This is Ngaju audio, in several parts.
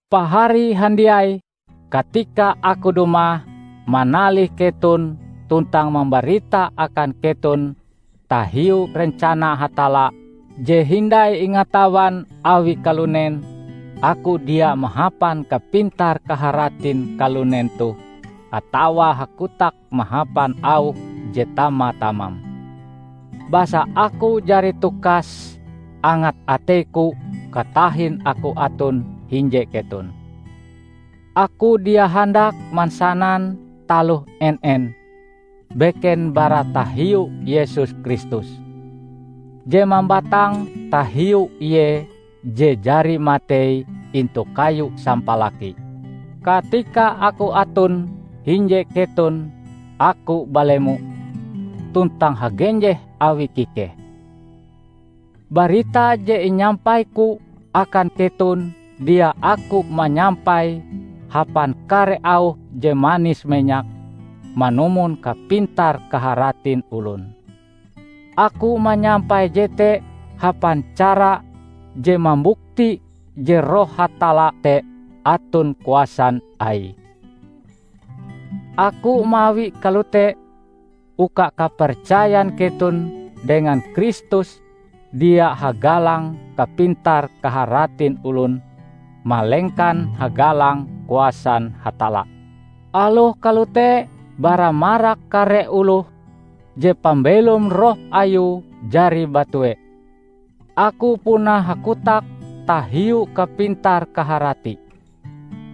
Pahari handiai! Katika aku dumah manalih keton tuntang mambarita akan keton tahiu rencana Hatalla je hindai ingatawan awi kalunen, aku dia mahapan kapintar-kaharatin kalunen toh atawa hakotak mahapan auh je tama-tamam. Basa aku jari tukas angat ateiku katahin aku aton hinje keton, aku dia handak mansanan taloh en-en, beken bara tahiu Yesus Kristus; je mambatang tahiu Ie je jari matei intu kayu sampalaki. Katika aku aton hinje keton aku balemo tuntang hagenjeh awi kikeh. Barita je inyampaiku akan keton dia aku manyampaie hapan kare auh je manis-menyak manumon kapintar-kaharatin olon. Aku manyampai jete hapan cara je mambukti je Roh Hatalla te aton kuasan Aie. Aku mawie kalote, uka kapercayan keton dengan Kristus dia hagalang kapintar-kaharatin olon, malengkan hagalang kuasan Hatalla. Aloh kalote, bara marak kare oloh je pambelom roh ayue jari batue, aku puna hakotak tahiu kapintar-kaharati.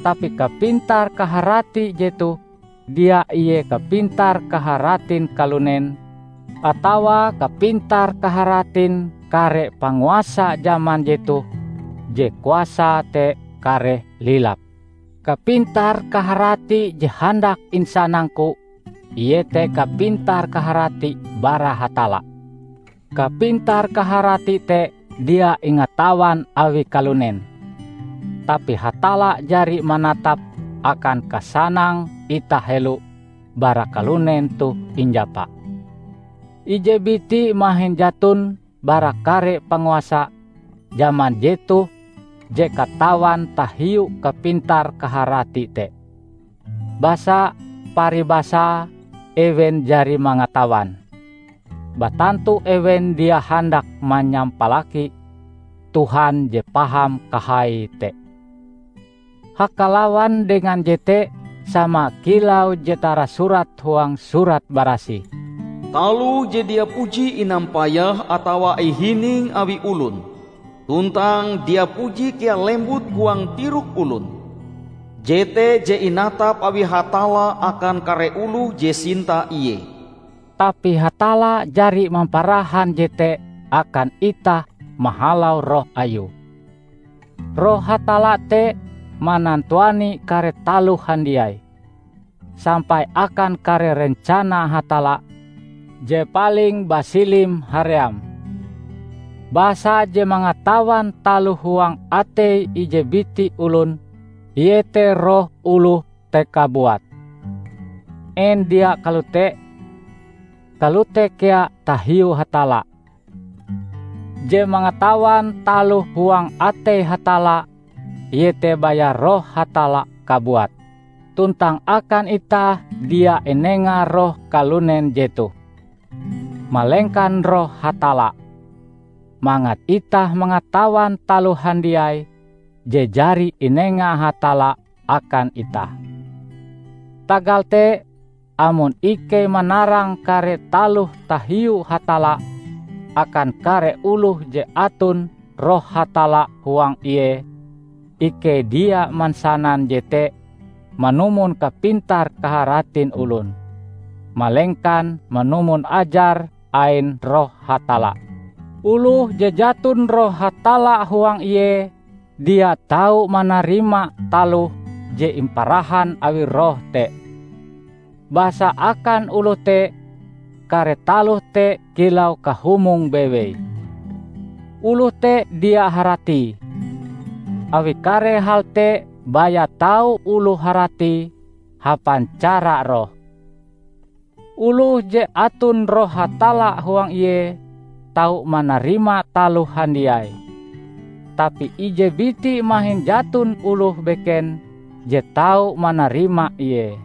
Tapi kapintar-kaharati jetoh dia ie kapintar-kaharatin kalunen, atawa kapintar-kaharatin kare panguasa jaman jetoh, je kuasae te kareh lilap. Kapintar-kaharati je handak insanangku iete kapintar-kaharati bara Hatalla. Kapintar-kaharati te dia ingatawan awi kalunen, tapi Hatalla jari manatape akan kasanang itah helo bara kalunen toh injapa. Ije biti mahin jaton bara kare panguasa jaman jetoh je katawan tahiu kapintar-kaharati te. Basa, paribasae ewen jari mangatawan, batantu ewen dia handak manyampalaki Tuhan je paham kahaie te. Hakalawan dengan jete, sama kilau je tarasurat huang Surat Barasih, "Taloh je dia puji inampayah atawa ihining awi olon, tuntang dia puji kea lembut huang tirok olon, jete je inatap awi Hatalla akan kare oloh je sinta Ie." Tapi Hatalla jari mamparahan jete akan itah mahalau Roh Ayue. Roh Hatalla te manantuani kare taloh handiai, sampai akan kare rencana Hatalla je paling basilim haream. Basa je mangatawan taloh huang atei ije biti olon iete roh oloh te kabuat, en dia kalote? Kalote kea tahiu Hatalla. Je mangatawan taloh huang atei Hatalla iete baya Roh Hatalla kabuat! Tuntang akan itah dia inenga roh kalunen jetoh, malengkan Roh Hatalla, mangat itah mangatawan taloh handiai je jari inenga Hatalla akan itah. Tagal te, amon ikei manarang kare taloh tahiu Hatalla akan kare oloh je aton Roh Hatalla huang ie, ikei dia mansanan jete manumon kapintar-kaharatin olon, malengkan manumon ajar ain Roh Hatalla. Oloh je jaton Roh Hatalla huang ie, dia tau manarima taloh je imparahan awi Roh te. Basa akan oloh te, kare taloh te kilau kahumong bewei. Oloh te dia haratie, awi kare hal te baya tau oloh haratie hapan cara roh. Oloh je aton Roh Hatalla huang ie, tau manarima taloh handiai, tapi ije biti mahin jaton oloh beken je tau manarima Ie.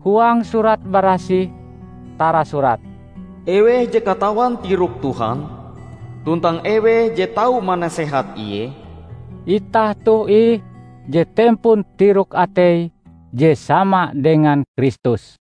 Huang Surat Barasih tarasurat, "Eweh je katawan tirok Tuhan? Tuntang eweh je tau manasehat Ie?" Itah toh ih je tempon tirok-atei je sama dengan Kristus!